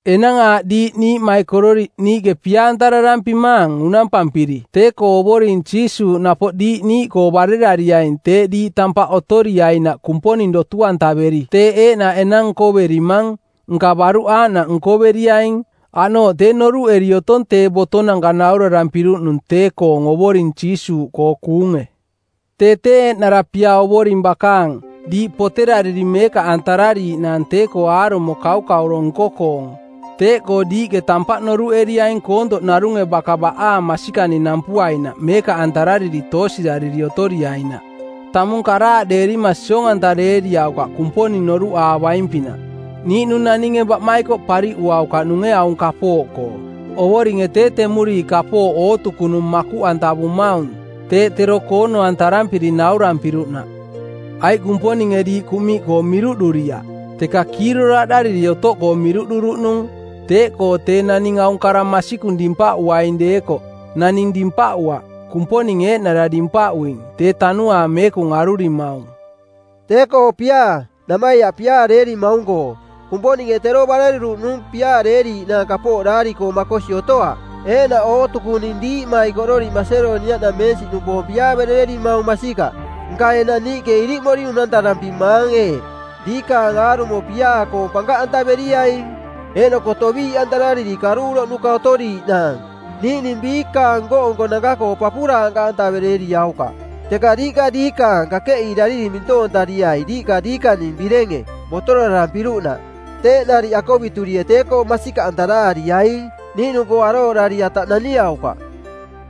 Enang aaꞌ diiꞌ niiꞌmaikororiꞌ niiꞌke diiꞌ pia-antararampimaang unampampiri tee-koo Ovoring Jiisuuꞌ napoꞌ diiꞌ niiꞌkoo barerariaing teeꞌ diiꞌ tampaꞌ otoriainaꞌ Kumponing dotu-antaveri teeꞌ eeꞌnaꞌ enang nkoverimang, nka baruꞌ aaꞌnaꞌ nkoveriaing. Aꞌnooꞌ tee noruꞌeri otong tee botonanka naurarampiruꞌnung tee-koong Ovoring Jiisuuꞌkoo kuunge. Tee tee eeꞌnara pia Ovoring bakaang, diiꞌ poterariri meekaꞌantarariiꞌnaang tee-koo aarumo kaukauro nko-koong. Teeꞌkoo diiꞌke tampaꞌ noruꞌeriaing koontoꞌ narunge baka baꞌaang masikani nampuainaꞌ meekaꞌantarariri toosirariri otoriainaꞌ. Tamung karaaꞌdeerima siong-antareeriaukaꞌ Kumponing noruꞌaavaing-pinaꞌ. Niiꞌnung naninge baꞌmaikoꞌ pariꞌuaukaꞌnunge aung kapooꞌkoo. Ovoringe tee temuriiꞌ kapooꞌ ootukunung makuꞌantavumaung, teeꞌ tero koono-antararampiri naurarampiruꞌnaꞌ. Aiꞌ Kumponinge diiꞌ kuꞌmiꞌkoo miruꞌduriaꞌ, teka kiiroraaꞌdariri otoꞌkoo miruꞌduruꞌnung. Teeꞌkoo tee naning aung kara masikung dimpaꞌuaing deekoꞌ, naning dimpaꞌuaꞌ, Kumponing eeꞌnara dimpaꞌuing, tee Tanuaang Meekung arurimaung. Tee-koo piaa, namaiaꞌ piaareerimaung-koo, Kumponinge tero bareruruꞌnung piaareeriiꞌnaang kapooꞌ daari-koo makosi otoaꞌ. Eeꞌnaꞌ ootukuning diiꞌmaikoriꞌ Masedoniaꞌnameensiꞌnupoong piaaverererimaung, masikaꞌ. Nka enang niiꞌke iriꞌmori unantarampimaang eeꞌ: Diikaang aarumo piaa-koong pankaꞌantaveriaing. Eeꞌnoko toꞌbii-antarariri kaꞌduuroꞌnuka otoriiꞌnaang niiꞌning biikaang nko-nkonanka-koo papuraankaꞌantaverereriaukaꞌ, teka diiꞌka diikaang, kakeꞌiirariri mintoontariai diiꞌka diikaning birenge, botorarampiruꞌnaꞌ. Teeꞌ nariꞌ akoviturie tee-koo masikaꞌantaraariaing. Niiꞌnung-koo arooꞌdari ataꞌ naniaukaꞌ.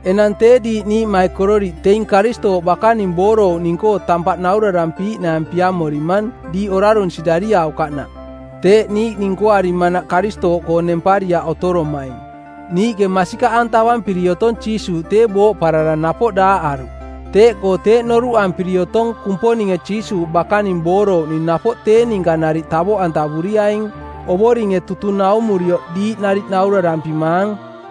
Enang tee diiꞌ niiꞌmaikororiꞌ teing Karistooꞌ bakaning boorouꞌning-koo tampaꞌ naurarampiiꞌnaang piamorimang diiꞌ orarun-sirariaukaꞌnaꞌ, teeꞌ niiꞌning nkoarimanaꞌ Karistooꞌkoo nempariaꞌ otoromaing. Niiꞌke masikaꞌantavampiri otong Jiisuuꞌ tee booꞌparara napoꞌ daaꞌaruꞌ. Teeꞌkoo teeꞌ noruꞌampiri otong Kumponinge Jiisuuꞌ bakaning boorouꞌning napoꞌ tee ninka nariꞌ tavoꞌantavuriaing. Ovoringe tutung naumuriko diiꞌ nariꞌ naurarampimaang: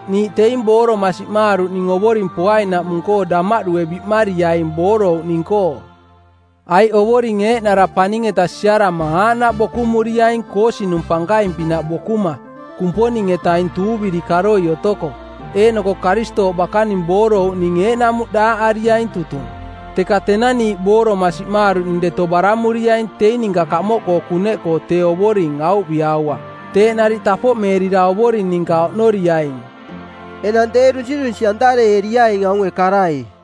Niiꞌ teing booroma siꞌmaaruꞌning Ovoring poainaꞌmung-koo damaꞌdue biꞌmariaing boorouꞌning-koo. Aiꞌ Ovoring eeꞌnara paning-eta siarama aaꞌnaꞌ bokumuriaing koosinung pankaing-pinaꞌ bokuma, Kumponing-etaing tuuviri karoi otoko. Eeꞌnoko Karistooꞌ bakaning boorouꞌning eeꞌnamuꞌ daaꞌariaing tutung. Teka tenang niiꞌ booroma siꞌmaaruꞌning deto baramuriaing teing ninka kamoꞌkoo kuneꞌkoo tee Ovoring auviꞌaua. Teeꞌ nariꞌ tapoꞌmeerira Ovoring ninka oꞌnoriaing. Enang tee dunsirunsi˜antareeriaing aunge karai.